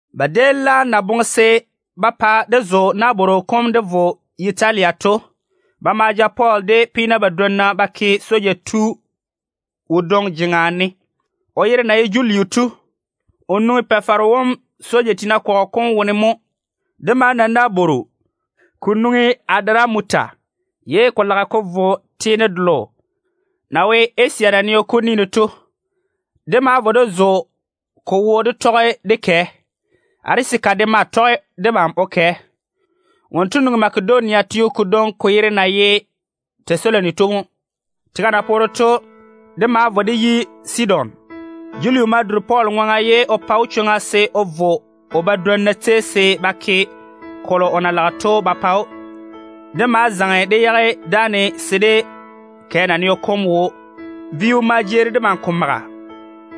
Ba déem laam na boŋe se ba pa dé zo nabworo dé vo Yitalia to, ba ma ja Pɔɔl de peena badwonna ba ke soja yiga tu wodwoŋi jeŋa ne, o yere na ye Juliu to. O nwoŋi Pa-faro wom tete soja tiina kɔgɔ kom wone mo. Dé ma na nabworo, ko nwoŋi Adaramuta ye ko lage ko vo teene delo na wo Asia naneo kom ni ne to. Dé ma vo dé zo ko wo dé tɔge dé kɛ. Arisaka de ma tɔge debam o kɛ. Wonto nwoŋi Makedonia teo kodwoŋi ko yere na ye Tɛsaloni to mo. Tega na poore to, dé ma vo dé yi Sidon. Juliu ma duri Pɔɔl ŋwaŋa ye o pa‑o chwoŋa se o vo o badwonna tei se ba ke kolo o na lage to ba pa‑o. Dé ma zaŋe dé yage dáane se dé kɛ naneo kom wo. Vo-dɛɔ maa jeeri debam ko maga.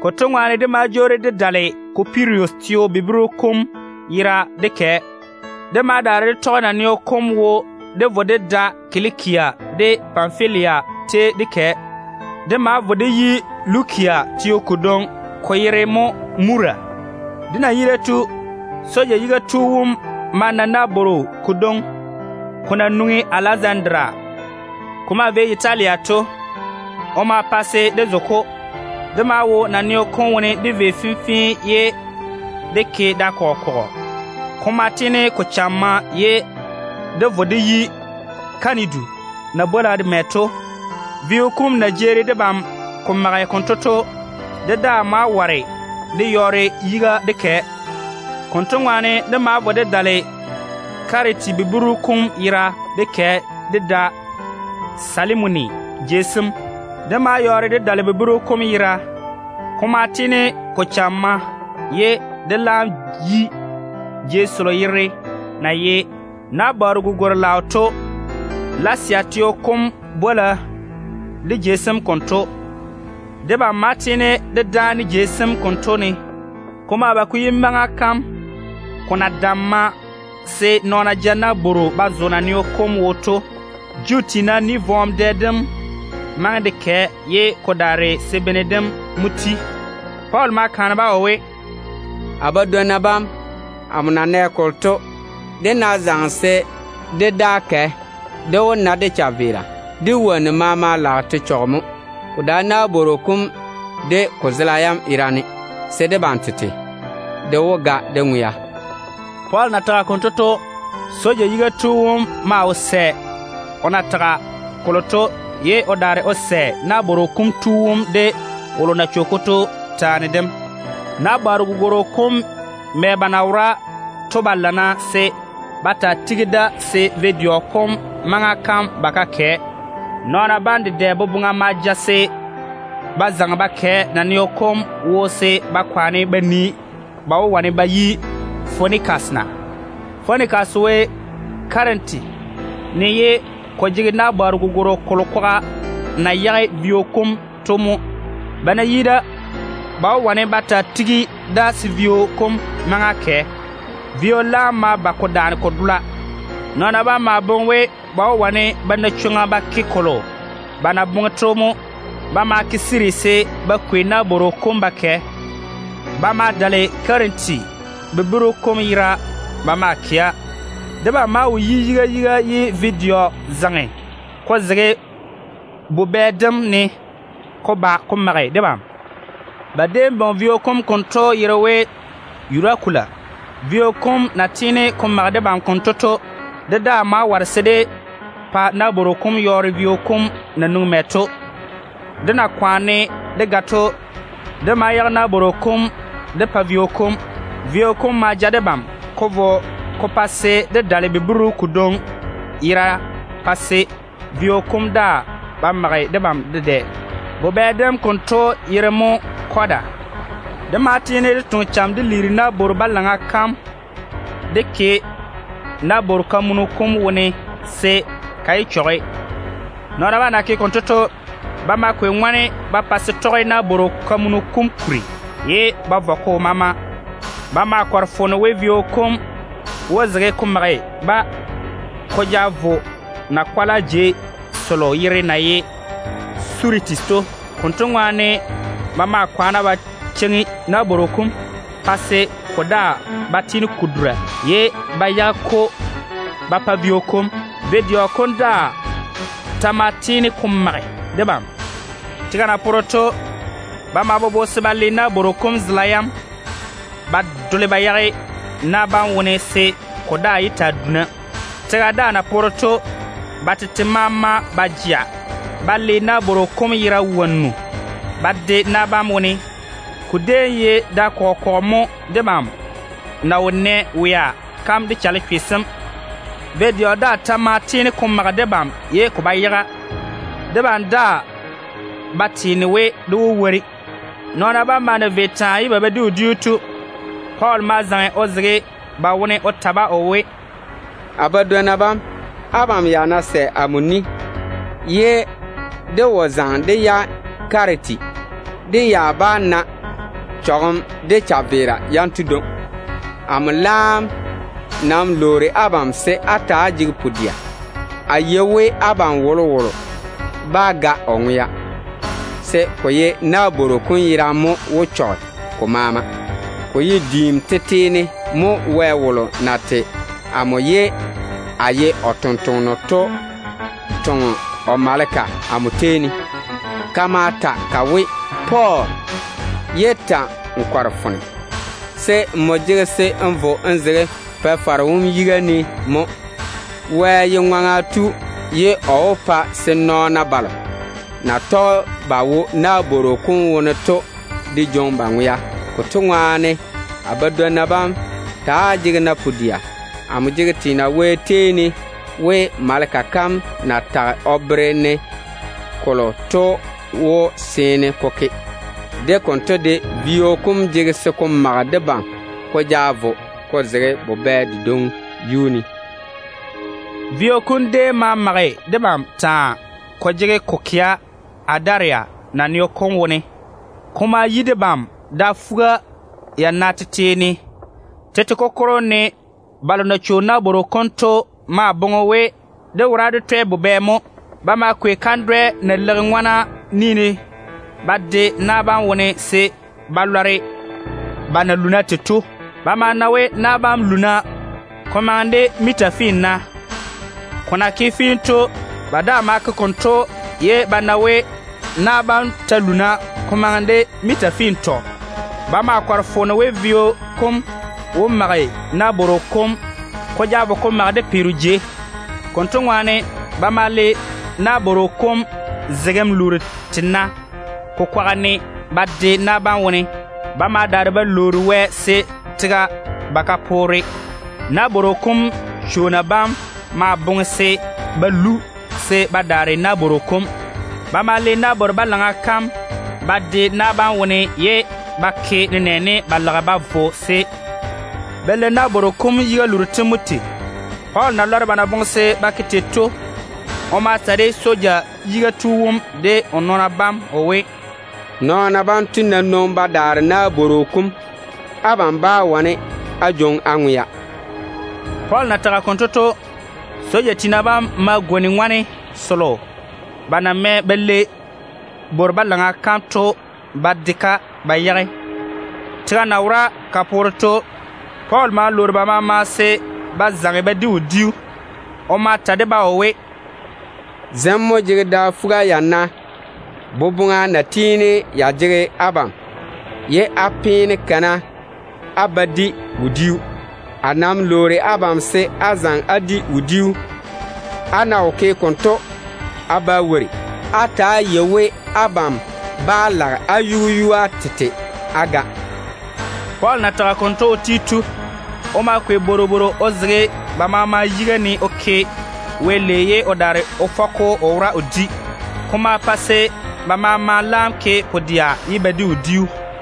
Konto ŋwaane dé ma jwoori dé dale Kupirus teo buburu kom yera dé kɛ. Dé ma daare dé tɔge naneo kom wo dé vo dé da Kilikia dé Panfilia tei dé kɛ. Dé ma vo dé yi Lukia teo kodwoŋi, ko yere mo Mura. Dé na yi da to, soja yiga tu wom ma na nabworo kodwoŋi ko na nwoŋi Alɛzandaria ko maa vei Yitalia to. O ma pa se dé zo-ko. Dé maa wo naneo kom wone dé vei fenfee ye dé ke da kɔgɔ kɔgɔ. Ko ma tiini ko chamma ye dé vo dé yi Kanidu na bwola mɛ to. Vio kom na jeeri debam ko mage konto to, dé daa ma ware dé yɔɔre yiga dé kɛ. Konto ŋwaane dé ma vo dé dale Kiriti buburu kom yera dé kɛ dé da Salimwoni jei sem. Dé ma yɔɔre dé dale buburu kom yera. Ko ma tiini ko chamma ye dé laam yi jei selo yere na ye ‘Nabwooru Gugwor-laao’ to. Lasea teo kom bwola de jei sem konto. Debam ma tiini dé dáane jei sem konto ne. Ko ma ba ko yi maŋa kam ko na damma se nɔɔna ja nabworo ba zo naneo kom wo to. Juu tiina ni-vɔɔm dɛ dem maŋe de kɛ ye ko daare se bene dem mo ti. Pɔɔl ma kaane-ba o we, “A badwonna bam, amo na nɛ kolo to, dé ná zaŋe se dé daa kɛ, dé wó na dé chaveera. Dé wonnu maama lage te chɔge mo. Ko dae nabworo kom de ko zela yam yerane, ko wae se debam tete de ga dé ŋwea.” Pɔɔl na tage konto to, soja yiga tu wom maa wo sɛ o na tage kolo to, ye o daare o sɛ nabworo kom tu wom de wolo na chwo-ko to taane dem. Nabwooru gugworo kom mɛ ba na wora to ba lana se ba taa tigi da se vo-dɛɔ kom maŋa kam ba ka kɛ. Nɔɔna bam dedɛ boboŋa ma ja se ba zaŋe ba kɛ naneo kom wo se ba kwaane ba nii ba wó wane ba yi Fonikas na. Fonikas wo Kiriti ne ye ko jege nabwooru gugworo kolo kwaga na yage vio kom to mo. Ba ná yi da, ba wó wane ba taa tigi da se vio kom maŋa kɛ. Vio laam ma nwoŋi tega-kuri seeni ko dole mɛmɛ. Nɔɔna bam maa boŋe we, ba wó wane ba na chwoŋa ba ke kolo ba na boŋe to mo. Ba ma ti ba yiga se ba kwei nabworo kom ba kɛ. Ba maa dale Kiriti buburu kom yera ba maa kɛa. Debam maa wo yi yiga yiga ye vo-dɛɔ zaŋe ko zege bubɛ dem ne ko ba ko mage debam. Ba déem bwoŋi vio kom konto yere we, ‘Yurakulu’. Vio kom na tiini ko mage debam konto to, dé daa ma ware se dé pa nabworo kom yɔɔre vio kom na nwoŋi mɛ to. Dé na kwaane dé ga to, dé ma yage nabworo kom dé pa vio kom. Vio kom ma ja debam ko vo ko pa se dé dale buburu kodwoŋi yera pa se vio kom daa ba mage debam dedɛ. Bubɛ dem konto yere mo Kɔda. Dé ma tiini dé toŋe cham dé liiri nabworo-balaŋa kam dé ke nabworo-kamunu kom wone se ka yé chɔge. Nɔɔna bam na ke konto to, ba ma kwei ŋone ba pa se tɔge nabworo-kamunu kom kuri ye ba vɔ ko maama. Ba maa kɔre foone we vio kom wó zege ko mage-ba ko ja vo na-kwala jei selo yere na ye Suritis to. Konto ŋwaane ba ma kwaane ba cheiŋi nabworo kom pa se ko daa ba tiini ko dura, ye ba yage-ko ba pa vio kom. Vo-dɛɔ daa ta ma tiini ko mage debam. Tega na poore to, ba ma bobo se ba le nabworo kom zela yam ba dole ba yage na bam wone se ko daa ye taa duna. Tega daa na poore to, ba tete ma ma ba jea ba le nabworo kom yera wonnu ba de na bam wone. Ko déem ye da kɔgɔ kɔgɔ mo debam na wo nɛ wea kam de chalechwe sem. Vo-dɛɔ daa ta maa tiini ko mage debam ye ko ba yaga. Debam daa ba teena we dé wó wori. Nɔɔna bam maa na vei taa ye ba ba di wodiu to, Pɔɔl ma zaŋe o zege ba wone o ta-ba o we, “A badwonna bam, abam ya ná sɛ amo ni ye dé wo yage Kiriti, dé ya bá na chɔgem de chaveera yanto dwoŋi. Amo laam nam lwoori abam se á ta‑á jege pu-dɛa. A yei we abam wolowolo bá ga o ŋwea, se ko ye nabworo kom yerane mo wó chɔge. Ko ye diim tete ne mo Wɛ wolo na tei amo ye a ye o tontoŋeno to toŋe o maleka amo tei ne. Ka ma ta ka we, ‘Pɔɔl, ye ta‑n kɔre foone, se nmo jege se n vo n zege Pa-faro wom yiga ne mo. Wɛ ye ŋwaŋa tu ye o wó pa se nɔɔna balo na tɔge ba wo nabworo kom wone to de jwoŋi ba ŋwea.’ Konto ŋwaane, a badwonna bam, ta‑á jege-na pu-dɛa. Amo jege teena Wɛ tei ne we, maleka kam na tage o bere-ne kolo to wó seene ko ke. De konto de, vio kom jege se ko mage debam ko ja vo ko zege bubɛ dedwoŋi yuu ne.” Vio kom déem maa mage debam taa ko jege ko kɛa Adaria naneo kom wone. Ko ma yi debam da fuga-yana tete ne. Tete kokoro ne balo na chwo nabworo kom to maa boŋe we dé wora dé twɛ bubɛ mo. Ba ma kwei kandwɛ na leiga ŋwana ni ne ba de na bam wone se ba lɔre ba na luuna tei to. Ba ma na we na bam luuna ba maŋe nenɛɛne miita finna mo tei. Ko na ke fee to, ba daa ma ke konto ye ba na we na bam ta luuna ko maŋe de miita fintɔ. Ba ma kɔre foone we, vio kom wó mage nabworo kom ko ja vo ko mage de peero. Konto ŋwaane ba ma le nabworo kom zegem luuru tena ko kwaga ne ba de na bam wone. Ba ma daare ba lwoori Wɛ taa, se tega ba ka poore. Nabworo kom chwoona bam ma boŋe se ba lu se ba daare nabworo kom. Ba ma le nabworo-balaŋa kam ba de na bam wone ye ba ke nenɛɛne ba lage ba vo se ba le nabworo kom yiga luuru tem mo tei. Pɔɔl na lɔre ba na boŋe se ba ke tei to, o ma ta de soja yiga tu wom de o nɔɔna bam o we, “Nɔɔna banto ná nwoŋi ba daare nabworo kom, abam bá wane á jwoŋi á ŋwea.” Pɔɔl na tage konto to, soja tiina bam ma gwoni ŋone selo ba na mɛ ba lei nabworo-balaŋa kam to ba de-ka ba yage. Tega na wora ka poore to, Pɔɔl ma lwoori ba maama se ba zaŋe ba di wodiu. O ma ta de-ba o we, “Zem mo jege da fuga-yana lwia dedɛ na jege abam ye á peene kana á ba di wodiu. A nam lwoori abam se á zaŋe á di wodiu. Á ná wo ke konto, á bá wori. Á ta‑á yei we abam ba lage á yu-yua tete á ga.” Pɔɔl na tage konto o ti to, o ma kwei bworobworo o zege ba maama yiga ne o ke Wɛ lei ye o daare o fɔ-ko o wora o di. Ko ma pa se ba maama laam ke pu-dɛa ye ba di wodiu.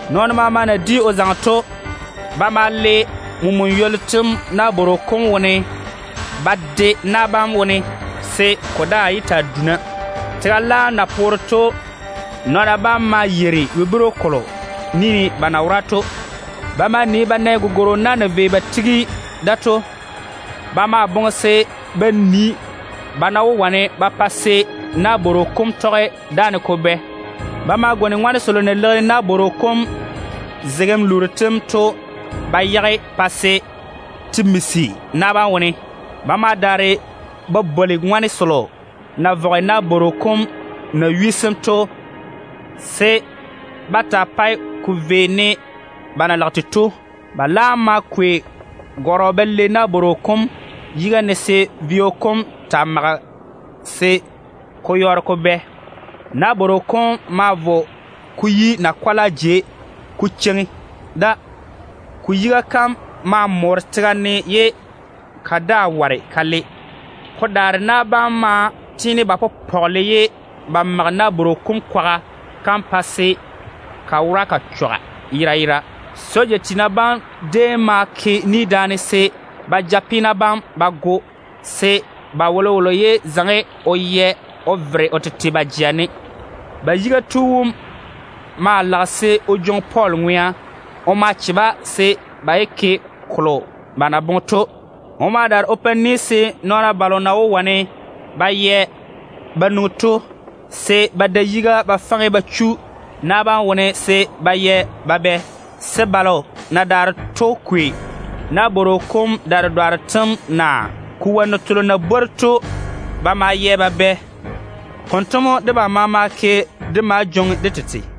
Nɔɔno maama na di o zaŋe to, ba ma le mena ywollu tem nabworo kom wone ba de na bam wone, se ko daa yé taa duna. Tega laam na poore to, nɔɔna bam maa yeiri buburu kolo ni ne ba na wora to. Ba ma nii ba na gugworo na na vei ba tigi da to. Ba maa boŋe se ba nii ba wó wane ba pa se nabworo kom tɔge dáane ko bɛ na. Ba ma gwoni ŋone selo na leigi nabworo kom zegem luuru tem to ba yage pa se te misi na bam wone. Ba ma daare ba bwoli ŋone selo na vɔge nabworo kom naywi sem to se ba taa pae ko vei ne ba na lage tei to. Ba laam ma kwei gɔrɔ ba lei nabworo kom yiga ne se vio kom taa maga se ko yɔɔre ko bɛ. Nabworo kom ma vo ko yi na-kwala jei ko cheiŋi da. Ko yiga kam ma moore kasolo wone ye ka daa ware ka le. Ko daare na bam maa tiini ba pɔgele ye ba mage nabworo kom kwaga kam pa se ka wora ka chɔga yera yera. Soja tiina bam déem ma ke ni daane se ba ja peena bam ba go, se ba wolowolo yé zaŋe o yɛ o vere o tete ba jea ne. Ba yiga tu wom maa lage se o jwoŋi Pɔɔl ŋwea. O ma che-ba se ba yé ke kolo ba na boŋe to. O ma daare o pa ni se nɔɔna balo na wó wane ba yɛ ba nwoŋi to, se ba da yiga ba faŋe ba chu na bam wone se ba yɛ ba bɛ, se balo na daare to kwei nabworo kom da-dedwaaro tem naa ko wonnu telo na bwori to ba ma yɛ ba bɛ. Konto mo debam maama ke dé ma jwoŋi dé tete.